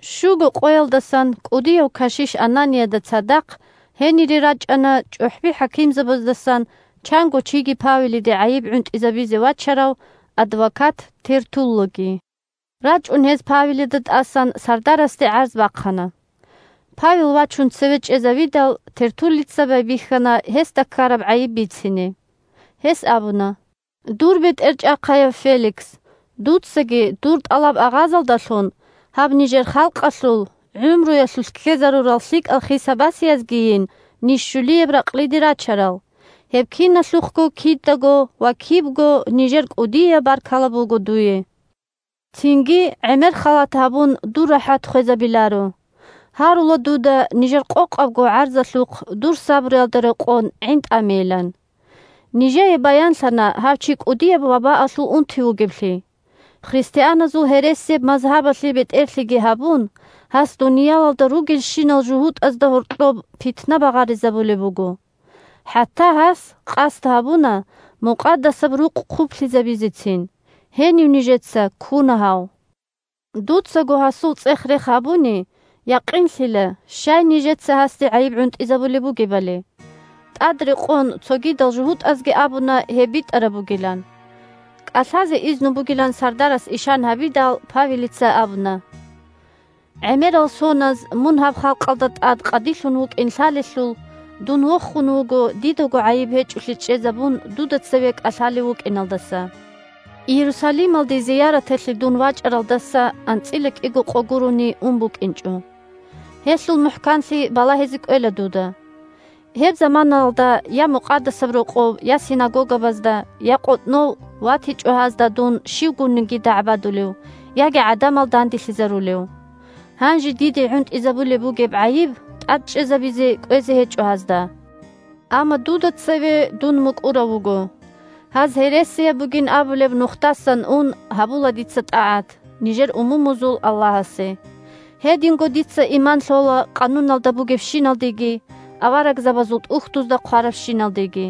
Щуго къоялдасан кӀудияв кашиш Ананияда цадахъ гьенире рачӀана чӀухӀби-хӀакимзабаздасан чанго чиги Павелиде гӀайиб гӀунтӀизабизе вачарав адвокат Тертуллги. РачӀун гьез Павелида тӀасан сардарасде гӀарз бахъана. Павел вачун цеве чӀезавидал, Тертуллица байбихьана гьесда ккараб гӀайиб бицине. Гьес абуна: – Дур бетӀерчӀахъаяв Феликс, дуцаги дур тӀалаб-агъазалдалъун гьаб нижер халкъалъул гӀумруялъулъ ккезарурал лъикӀал хиса-басиязгийин ниж щулияб ракълиде рачарал, гьеб киналъухъго кидаго ва кибго нижер кӀудияб баркала буго дуе. Цинги, гӀемер халат гьабун, дур рахӀат хвезабиларо. Гьарула дуда нижер къокъабго гӀарзалъухъ, дур сабруялда рекъон, гӀинтӀамейилан. Нижее баянлъана гьав чи кӀудияв вабаалъул унти вугевлъи. Христианазул гьересияб мазгьабалъе бетӀерлъиги гьабун, гьас дуниялалда ругелщинал жугьутӀазда гьоркьоб питна багъаризабулеб буго. ХӀатта гьас къасд гьабуна Мукъадасаб Рукъ хъублъизабизецин, гьенив нижеца ккуна гьав. Дуцаго гьасул цӀех-рех гьабуни, якъинлъила щай нижеца гьасде гӀайиб гӀунтӀизабулеб бугебали. ТӀад рекъон, цогидал жугьутӀазги абуна гьеб битӀараб бугилан. КӀалъазе изну бугилан сардарас ишан гьабидал, Павелица абуна: – ГӀемерал соназ мун гьаб халкъалда тӀад къадилъун вукӀин лъалелъул, дун вохун вуго дидаго гӀайиб гьечӀолъи чӀезабун дуда цеве кӀалъалев вукӀиналдаса. Иерусалималде зияраталъе дун вачӀаралдаса анцӀила кӀиго къо гурони ун букӀинчӀо. Гьелъул мухӀканлъи балагьизе кӀвела дуда. Гьеб заманаялда я Мукъадасаб Рокъов, я синагогабазда, я къотӀнов ватичӀо гьазда дун щивгунниги дагӀбадулев, яги гӀадамал данделъизарулев. Гьанже диде гӀунтӀизабулеб бугеб гӀайиб тӀад чӀезабизе кӀвезе гьечӀо гьазда. Амма дуда цеве дун мукӀурав вуго: гьаз гьересияб бугин абулеб Нухдасан ун гьабула дица тӀагӀат нижер умумузул Аллагьасе. Гьединго дица иман лъола къануналда бугебщиналдеги Аварагзабазул ТӀухьдузда хъварабщиналдеги.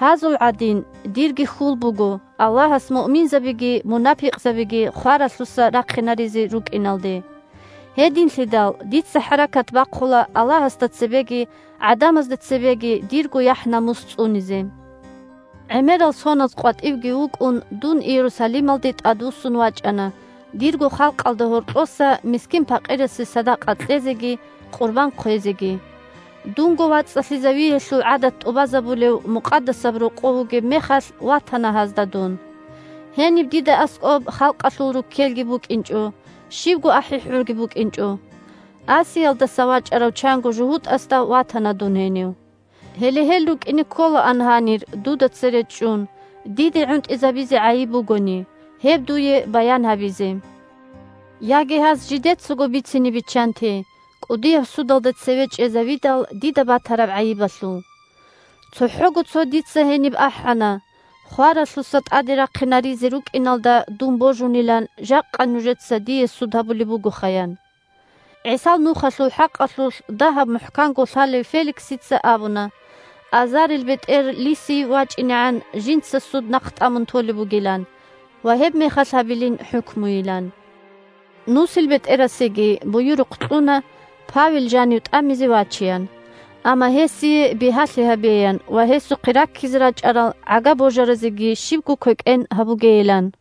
Гьазул гӀадин, дирги хьул буго Аллагьас муъминзабиги мунапикъзабиги хваралъуса рахъинаризе рукӀиналде. Гьединлъидал дица хӀаракат бахъула Аллагьасда цебеги гӀадамазда цебеги дирго яхӀ-намус цӀунизе. ГӀемерал соназ къватӀивги вукӀун, дун Иерусалималде тӀадвуссун вачӀана дирго халкъалда гьоркьоса мискин-пакъирасе садакъа кьезеги къурбан хъвезеги. Дунго вацӀцӀалъизавиялъул гӀадат тӀубазабулев Мукъадасаб Рокъов вугеб мехалъ ватана гьазда дун. Гьениб дида аскӀоб халкъалъул руккелги букӀинчӀо, щибго ахӀи-хӀурги букӀинчӀо. Асиялдаса вачӀарав чанго жугьутӀасда ватана дун гьенив. Гьеле гьел рукӀине кколаан гьанир дуда цере чӀун, диде гӀунтӀизабизе гӀайиб бугони, гьеб дуе баян гьабизе. Яги гьаз жидецаго бицине биччанте, кӀудияб судалда цеве чӀезавидал, дида батараб гӀайибалъул. ЦохӀого цохӀо дица гьениб ахӀана: «Хваралъуса тӀаде рахъинаризе рукӀиналда дун божунилан жакъа нужеца дие суд гьабулеб бугоха!» – ян. ГӀисал Нухалъул хӀакъалъулъ дагьаб мухӀканго лъалев Феликсица абуна, азарилбетӀер Лисий вачӀинегӀан жинца суд нахътӀамун толеб бугилан ва гьебмехалъ гьабилин хӀукмуйилан. НусилбетӀерасеги буюрухъ кьуна Павел жанив тӀамизе вачеян, амма гьесие бигьалъи гьабеян ва гьесухъе раккизе рачӀарал гӀага-божаразеги щибго квекӀен гьабугейилан.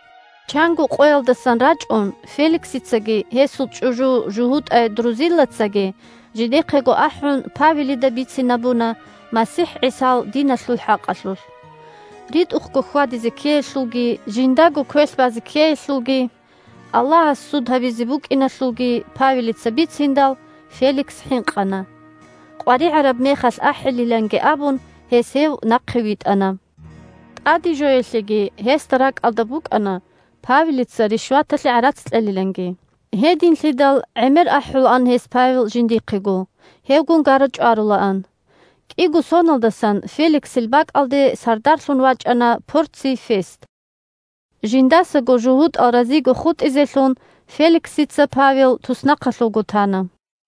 Чанго къоялдасан рачӀун Феликсицаги гьесул чӀужу жугьутӀай Друзиллацаги, жидехъего ахӀун, Павелида бицинабуна МасихӀ ГӀисал диналъул хӀакъалъулъ. РитӀухъго хьвадизе ккеялъулги, жиндаго квелъ базе ккеялъулги, Аллагьас суд гьабизе букӀиналъулги Павелица бициндал, Феликс хӀинкъана. КъваригӀараб мехалъ ахӀилиланги абун, гьес гьев нахъе витӀана. ТӀаде жоялъеги гьесда ракӀалда букӀана Павелица ришваталъе гӀарац кьелиланги. Гьединлъидал гӀемер ахӀулаан гьес Павел жиндихъего, гьевгун гара-чӀварулаан. КӀиго соналдасан Феликсил бакӀалде сардарлъун вачӀана Порций Фест. Жиндасаго жугьутӀал разиго хутӀизелъун, Феликсица Павел туснахъалъувго тана.